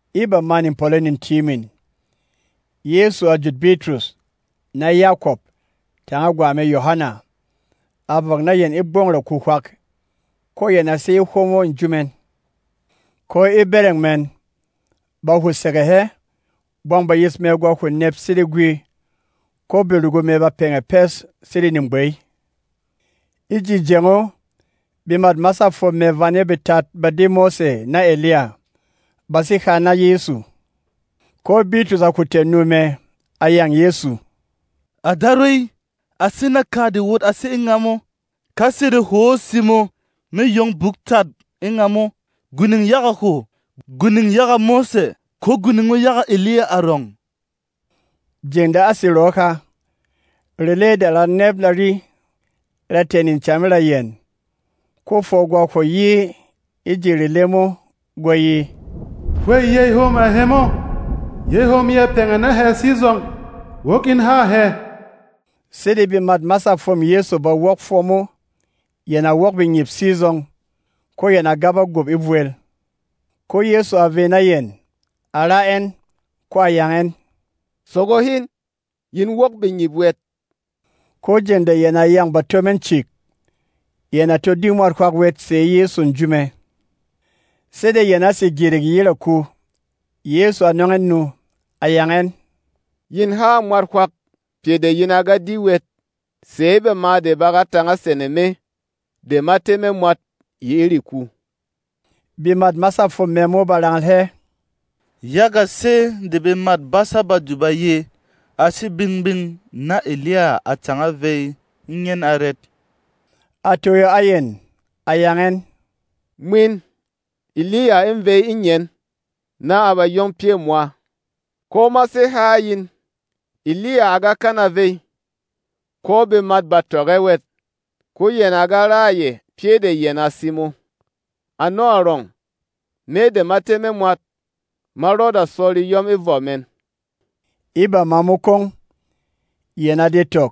E bamâ nepɔlɔ netyiimin, Yɛsu a jut Bitrus, na Yakɔp, tanga gwa mɛ Yohana, a vɔk na yɛn e gbɔng raku hwak, ko yɛn a sé e hwomo nju mɛn. Ko e bɛrɛng mɛn, ba hwo sege hɛ. Bwang bayis mɛ gwa hwo nɛp sede gwi, ko berugu mɛ ba pɛngɛ pes sede negbey. E ji jeng o, bemât masâ fwom mɛ vane betat ba di Mose na Eliya, ba sé ha na Yɛsu. Ko Bitrus a hwo tɛ̀ nu mɛ, a yâng Yɛsu, “À Darwey, a sé naka de wot a sé e ngamo! Ka sede hwô simo, mê yong buk tat e ngamo: Gwining yaga hwo, gwining yaga Mose, ko gwining o yaga Eliya arɔng.” Jeng de a sé rɔɔ ha, rele de ra nɛp ra yi, ra tɛ̀ necam e ra yɛn. Ko fwɔ gwa hwo yi e ji rele mo, gwa ye, “Hwêy yey hom a hemo, yey hom ya pɛngɛ na hɛ sizɔng! Wok in hâ hɛ!” Sede bemât masâ fwôm Yɛsu ba wok fwɔ mo, yɛn a wok bengyip sizɔng, ko yɛn a gaba gup e vwel. Ko Yɛsu a vey na yɛn, a ra ɛn, ko a yang ɛn, “Sogo hin! Yin wok bengyip wɛt.” Ko jeng de yɛn a yâng bato mɛn cik, yɛn a to di mwat hwak wɛt sɛ̌ Yɛsu nju mɛ. Sede yɛn a sé gyirik yi e raku, Yɛsu a nɔng ɛn nu, a yang ɛn, “Yin ha a mwat hwak pyɛ de yin a ga di wɛt sɛ̌ bama de ba ga tānga sene Me de ma tɛ́ me mwat yi e reku.” Bemât masâ fwom mɛ mo ba rangal hɛ, “Yaga sɛ́ de bemât basâ Badu ba ye, a sé gbing-gbing na Eliya a tānga vey e ngyen arɛt?” A toyo a yɛn, a yang ɛn, “Mwin, Eliya ê vey e ngyen, na a ba yong pyɛ̂ mwa. Ko ma sé ha a yin, Eliya à ga kana vey, ko bemat bà tɔk ɛ wɛt, ko yɛn à ga ra a yɛ pyɛ́ de yɛn à simo. Ano arɔng, Me de ma tɛ́ me mwat ma rɔda sɔ reyɔm e vɔ mɛn.” E bama mo kwong, yɛn a de tɔk,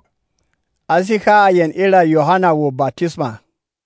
a sé ha a yɛn e ra Yohana wo batisma.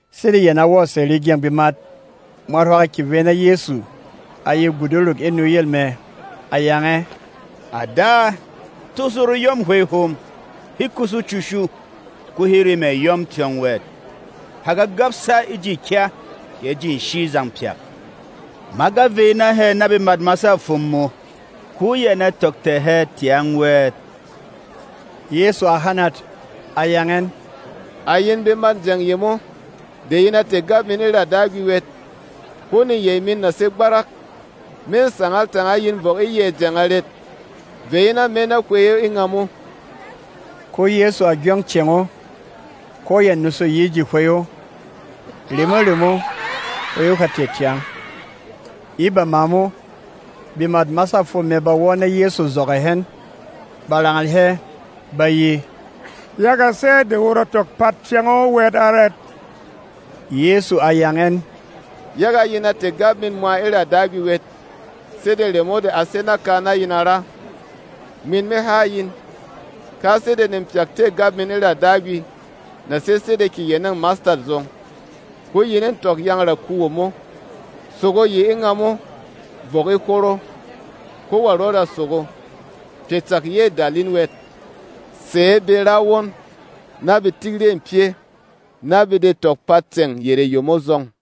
Sede yɛn a wɔ̀ sɛ̀ regyɛng bemat, mwat hwak a kyè vey na Yɛsu, a ye guduruk e nuyel mɛ, a yang ɛ, “À Da, tosho reyɔ̂m hwey hom. He kushu cushu, ko he re mɛ̀ yɔ́m tyɔng wɛt. Ha ga gabsa e ji kya kɛ e ji nshi zang pyak. Ma ga vey na hɛ na bemât masâ fwom mō, ko yɛn a tɔk tɛ̀ hɛ tyang wɛt.” Yɛsu a hanat, a yang ɛn, “À yin bemât jeng yemo de yin a tɛ̀ gap min e ra Dagwi wɛt, ko neyey min na sé gbarak! Mê sangal tanga yin vɔk e yɛ̌ jeng arɛt? Vey in a me na hwey o e ngamo.” Ko Yɛsu a gyong cēng o, ko ya nusu yi e ji hwey o. Remo-remo, hwey o ha tɛ̀ tyang. E bama mo, bemât masâ fwom mɛ ba wɔ́ na Yɛsu zɔgɔ̂ hɛn, ba rangal hɛ, ba ye, “Yaga sɛ́ de wot a tɔk pat cēng o wɛt arɛt?” Yɛsu a yang ɛn, “Yaga yin a tɛ̀ gap min mwa e ra Dagwi wɛt, sede remo de a sé naka na yin a ra. Mwin me ha a yin: Ka sede nepyak tɛ̂ gap min e ra Dagwi na sé sede keyenêng mastat zɔng, ko yin ê tɔk yâng raku womo, ‘Sogo yi e ngamo vɔk e hworo’, ko wa rɔda sogo. Pyɛ cak yê dal in wɛt. [ Sɛ̌ be ra won na be tik rê pyɛ́, na be de tɔk pat ceng yerê yemo zɔng.]”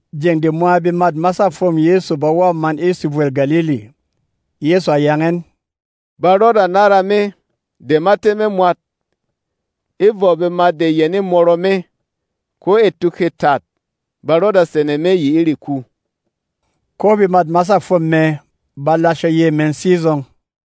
Jeng de mwa bemât masâ fwôm Yɛsu ba wɔ̀ man e sevwêl Galili, Yɛsu a yang ɛn, “Ba rɔda nára Me de ma tɛ́ me mwat e vɔ bemat de yɛn ê mɔrɔ me. Ko e tuk hê tat, ba rɔda sene me yi e reku.” Ko bemât masâ fwom mɛ ba lashe yey mɛn sizɔng.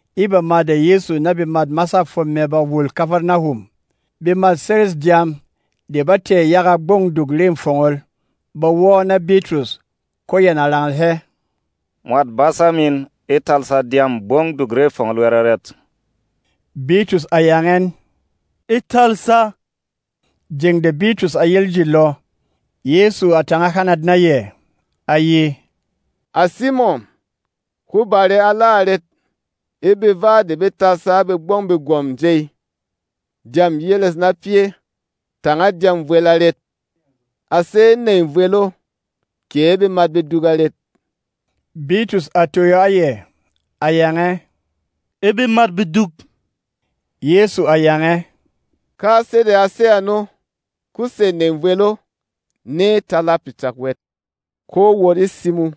E bama de Yɛsu na bemât masâ fwom mɛ ba wul Kafarnahum, bemât seres dyām de ba tɛ̀ yaga Gbɔng Duk Re Fongol ba wɔ́ na Bitrus, ko yɛn a rangal hɛ, “Mwat Basa min e talsa dyâm Gbɔng Duk Re Fongol wɛt arɛt?” Bitrus a yang ɛn, “E talsa.” Jeng de Bitrus a yel e ji lɔ, Yɛsu a tānga hanat na yɛ, a ye, “À Simɔn, hwó bare ala arɛt? E beva de be talsa a begbɔng begwɔ̀m jey dyâm yeles na pyɛ́ tanga dyâm vwel arɛt? A sé e nèy vwel o kɛ e bemat beduk arɛt?” Bitrus a toyo a yɛ, a yang ɛ, “E bemat beduk.” Yɛsu a yang ɛ, “Ka sede a sé ano, ko sɛ̌ nèy vwel o nê tala pyɛ cak wɛt. Ko wot e simo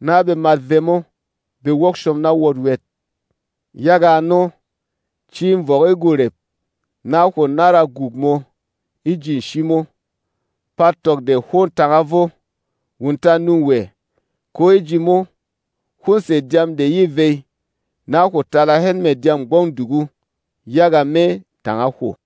na bemat vemo be wok shom na wot wɛt. Yaga ano, ci vɔk e gworep, na hwo nára guk mō e ji nshi mo. Pat tɔk de hwô tānga vo. Wunta nû wɛ, ko e ji mo, hwô sɛ̀ dyam de yê vey, na hwo tala hɛn mɛ̀ dyâm Gbɔng Duk o yaga me tanga hwo.”